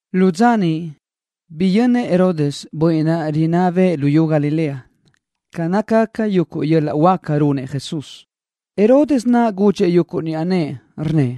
Lu dza niʼ, biyönnëʼ Herodes, bönniʼ rinná bëʼë luyú Galilea, ca nácagaca yuguʼ yöl-laʼ huáca runëʼ Jesús. Herodes naʼ gudxëʼ yuguʼ niʼa nëʼë, rnnëʼ: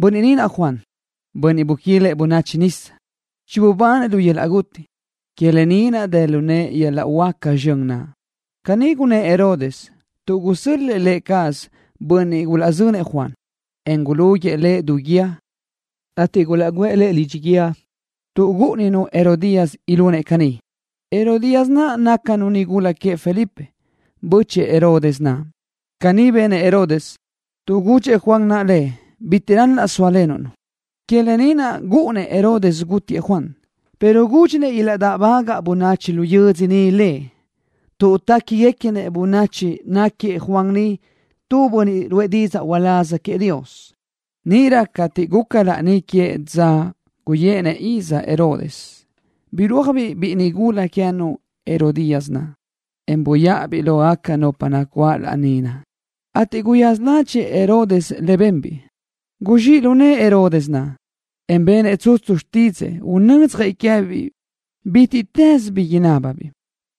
—Bönniʼ naʼ Juan, bönniʼ buquilëʼ bönachi nisa. Chibubanëʼ lu yöl-laʼ guti. Que lë ni naʼ dë lu nëʼë yöl-laʼ huáca zxön naʼ. Caní gunnë́ʼ Herodes tuʼ gusö́l-lëʼë lë cazëʼ bönniʼ gulaʼzönëʼ Juan, en gulúguiʼë lëʼ du guíë, ateʼ gulaʼguʼë lëʼ lidxi guíë tuʼ gúʼuninu Herodías ilunëʼ caní. Herodías naʼ gúcanu nigula queëʼ Felipe, bö́chëʼë Herodes naʼ. Caní benëʼ Herodes, tuʼ gudxëʼ Juan naʼ lëʼ: “Bitiʼ ral-laʼ sóalenuʼ-nu.” Que lë ni naʼ gúʼunnëʼ Herodes gútiëʼ Juan, pero gúdxinëʼ ilaʼdáʼbagaʼ bönachi lu yödzö niʼ lëʼ, tuʼ téquiguequi bönachi náquiëʼ Juan naʼ tu bönniʼ ruʼë didzaʼ uláz queëʼ Dios. Níʼirö cateʼ guca laní que dza guyéʼenëʼ iz Herodes, birúajbiʼ biʼi nigula queë́nu Herodías naʼ, en buyáʼabiʼ lógaca nupa nacuáʼ laní naʼ, ateʼ guyaza ládxëʼë Herodes le benbiʼ. Guzxíʼ lu nëʼë Herodes, en benëʼ tsutsu xtídzëʼë unödzjëʼ queë́biʼ bítiʼtës bi inábibiʼ lëʼ.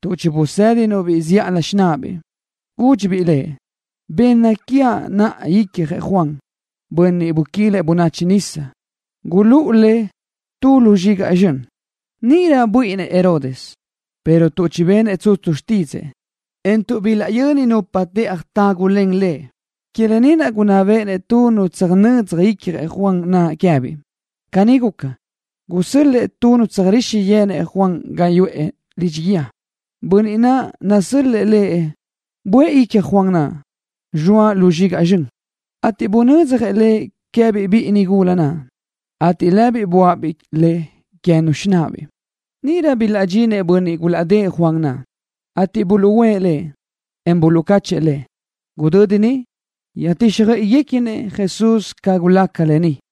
Tuʼ chibusédinu-biʼ zíʼalö xináʼabiʼ, gúdxibiʼ lëʼ: —Benna quiaʼ naʼa icjëʼ Juan, bönniʼ buquilëʼ bönachi nisa. Gulúʼu le tu lu zxigaʼ zxön. Níʼirö buíʼinnëʼ Herodes, pero tuʼ chibenëʼ tsutsu xtídzëʼë, en tuʼ bilaʼyöni nupa teʼaj tágulen lëʼ, que lë ni naʼ gunná béʼenëʼ nu tsöjnödzaj icjëʼ Juan naʼ queë́biʼ. Caní guca, gusö́l-lëʼë nu tsöjríxi yenëʼ Juan ga niʼ yuʼë lidxi guíë. Bönniʼ naʼ nasö́l-lëʼë buʼë icjëʼ Juan naʼ, zxoa lu zxigaʼ zxön, ateʼ bunödzjëʼ le queë́biʼ biʼi nigula naʼ, ateʼ lëbiʼ buáʼabiʼ le queë́nu xináʼabiʼ. Níʼirö bilaʼdxinëʼ bönniʼ gulaʼdë́ʼë Juan naʼ, ateʼ buluʼúʼë lëʼ, en buluʼcáchëʼë lëʼ. Gudödi niʼ, yöjtíxjöiʼiguequinëʼ Jesús ca gulaca lë ni.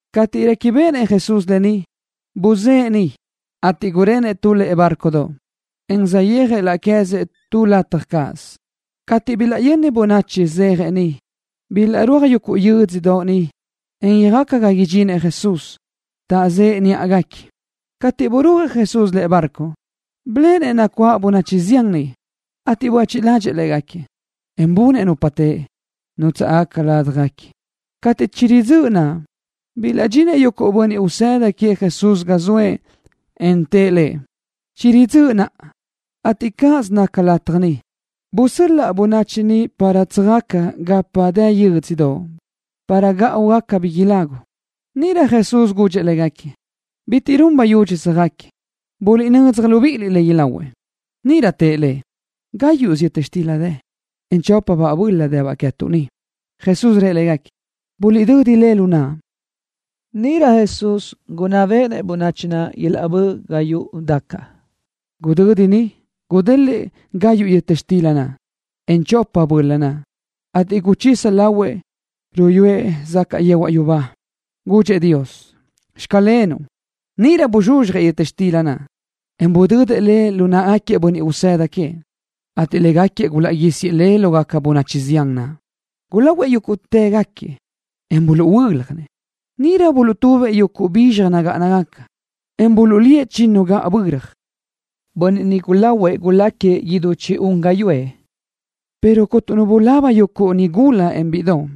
Cateʼ réquibeʼenëʼ Jesús lë ni, buzë́ʼë niʼ, ateʼ gurenëʼ tu lëʼe bárcodoʼ, en saʼyéajëʼ laʼ queë́zëʼ tu lataj cáʼasö. Cateʼ bilaʼyöni bönachi zéajëʼ niʼ, bilaʼrúaj yuguʼ yödzö niʼ, en yöjaca ga niʼ idxinëʼ Jesús, taʼzëʼe níʼaguequi. Cateʼ burúajëʼ Jesús lëʼe barco, biléʼenëʼ nacuáʼ bönachi zián niʼ, ateʼ buéchiʼ ládxëʼë léguequi, en bunëʼ nupa teʼe, nútsaʼgaca ládjaguequi. Cateʼ chiridzö́ʼ dza naʼ, bilaʼdxinëʼ yuguʼ bönniʼ usëda queëʼ Jesús ga zoëʼ, en tëʼ Lëʼ: —Chiridzö́ʼ naʼa, ateʼ cáʼasö naca lataj ni. Busöl-laʼ bönachi ni para tsöjaca gapa dë yö́dzödoʼ para gáʼugaca bi ilagu. Níʼirö Jesús gudxëʼ légaquiëʼ: —Bitiʼ run bayudxi tsöjáquiëʼ. Buliʼnödzaj libíʼiliʼ le ilahuëʼ. Níʼirö tëʼ Lëʼ: —Gáyuʼsö yöta xtila dë, en chópasöbaʼ böla dëbaʼ queë́tuʼ ni. Jesús rëʼ légaquiëʼ: —Buliʼdödi le lu naʼa. Níʼirö Jesús gunná béʼenëʼ bönachi naʼ ilaʼbö́ʼ ga yuʼu dacaʼ. Gudödi naʼ gudélëʼë gayuʼ yöta xtila naʼ, en chópabaʼ böla naʼ, ateʼ guchisa lahuëʼ, ruyúëʼ zacaʼ yehuaʼ yubá. Gudxëʼ Dios: “Xclenuʼ.” Níʼirö buzxuzxjëʼ yöta xtila naʼ, en budödëʼ le lu náʼagaquiëʼ bönniʼ usëda queëʼ, ateʼ légaquiëʼ gulaʼguísiëʼ le lógaca bönachi zián naʼ. Gulahuëʼ yúguʼtëgaquiëʼ, en buluʼhuö́ljanëʼ. Níʼirö buluʼtubëʼ yuguʼ bizxaj nagáʼanagaca, en buluʼlíëʼ chinnu gaʼböra. Bönniʼ niʼ gulahuëʼ guláquiëʼ idú chi-un gáyuʼë, pero cuntu nu bulaba yuguʼ nigula, en bíʼidoʼ.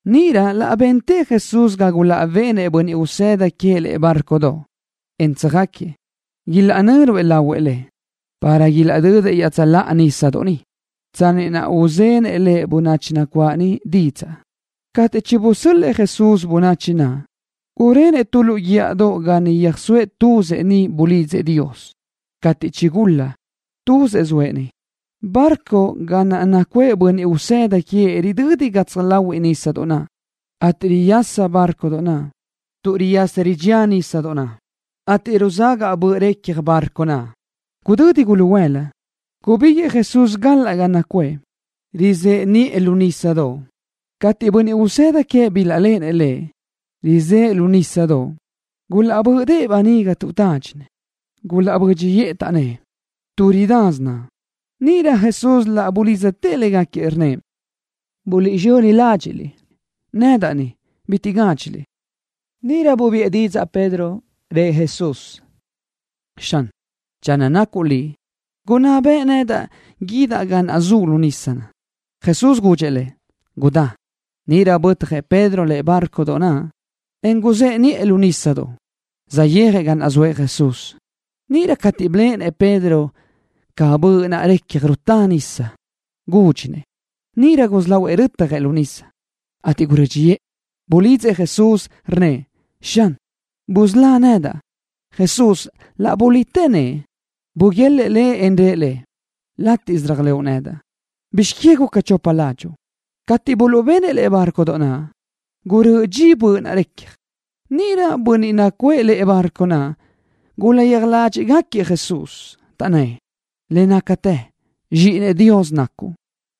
Níʼirö laʼ bentëʼ Jesús ga gulaʼbenëʼ bönniʼ usëda queëʼ lëʼe bárcodoʼ, en tsöjáquiëʼ, ilaʼnö́ruëʼ lahuëʼ Lëʼ, para ilaʼdödëʼ iaʼtsöláʼa nísadoʼ niʼ, tsanni naʼ uzenëʼ Lëʼ bönachi nacuáʼ niʼ didzaʼ. Cateʼ chibusö́l-lëʼë Jesús bönachi naʼ, gurenëʼ tu lu guíʼadoʼ ga niʼ yöjsóëʼ tuzëʼ. Niʼ bulidzëʼ Dios. Cateʼ chigul-la, tuzëʼ zoëʼ niʼ. Bárcodoʼ ga naʼ nacuʼë bönniʼ usëda queëʼ ridödi gatsaj láhuiʼlö nísadoʼ naʼ, ateʼ riyasa bárcodoʼ naʼ tuʼ riyasa ridxía nísadoʼ naʼ, ateʼ ruzagaʼ böʼ recja barco naʼ. Gudödi guluhuëla, gubíguiʼë Jesús galaʼ ga naʼ nacuʼë, rizëʼe niʼë lu nísadoʼ. Cateʼ yuguʼ bönniʼ usëda queëʼ bilaʼléʼenëʼ Lëʼ, rizëʼe niʼë lu nísadoʼ, gulaʼbö́ʼdëʼë böniga tuʼ tádxinëʼ. Gulaʼbö́dxiʼë, taʼnnë́ʼ: —Tuʼ ridasö naʼ. Níʼirö Jesús laʼ bulidztëʼ légaquiëʼ, rnnëʼ: —Buliʼzxöni ládxiʼliʼ. Nedaʼ ni. Bitiʼ gádxiliʼ. Níʼirö bubiʼë didzaʼ Pedro, rëʼ Jesús: —Xan, channö nacuʼ Liʼ, gunná beʼe nedaʼ guídaʼ ga naʼ zuʼ lu nisa. Jesús gudxëʼ lëʼ: —Gudá. Níʼirö bötjëʼ Pedro lëʼe bárcodoʼ naʼ, en guzëʼe niʼë lu nísadoʼ, saʼyéajëʼ ga naʼ zoëʼ Jesús. Níʼirö cateʼ biléʼenëʼ Pedro ca böʼ naʼ recja rutá nisa, gúdxinëʼ. Níʼirö gusí lahuëʼ rötjëʼ lu nisa, ateʼ gurö́dxiʼë. Bulidzëʼ Jesús, rnnëʼ: —Xan, busölá nedaʼ. Jesús laʼ bulitë nëʼë. Buguélëʼë lëʼ, en rëʼ lëʼ: —Látiʼsö réajlëʼu nedaʼ. ¿Bizx que guca chopa ládxuʼu? Cateʼ buluʼbenëʼ lëʼe bárcodoʼ naʼ, gurö́ʼö dxi böʼ naʼ recja. Níʼirö bönniʼ nacuʼë lëʼe bárcodoʼ naʼ gulaʼyéaj ládxiʼgaquiëʼ Jesús, taʼnnë́ʼ: —Le nácatë, Zxíʼinëʼ Dios nacuʼ.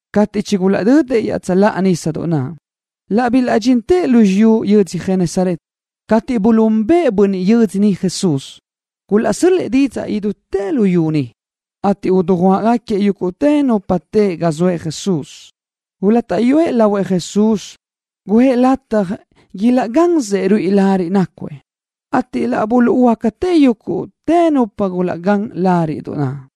Cateʼ chigulaʼdödëʼ iaʼtsöláʼa nísadoʼ naʼ, laʼ bilaʼdxintëʼ lu xiyú yödzö Genesaret. Cateʼ buluʼúnbëʼë bönniʼ yödzö niʼ Jesús, gulaʼsö́l-lëʼë didzaʼ idútë luyú niʼ, ateʼ dujuáʼgaquiëʼ yúguʼtë nupa teʼe ga naʼ zoëʼ Jesús. Gulátaʼyuëʼ lahuëʼ Jesús guʼë légaquiëʼ lataj ilaʼgansëʼ ruíʼi lariʼ nácuëʼ, ateʼ laʼ buluʼhuöácatë yúguʼtë nupa naʼ bilaʼgán lariʼ naʼ.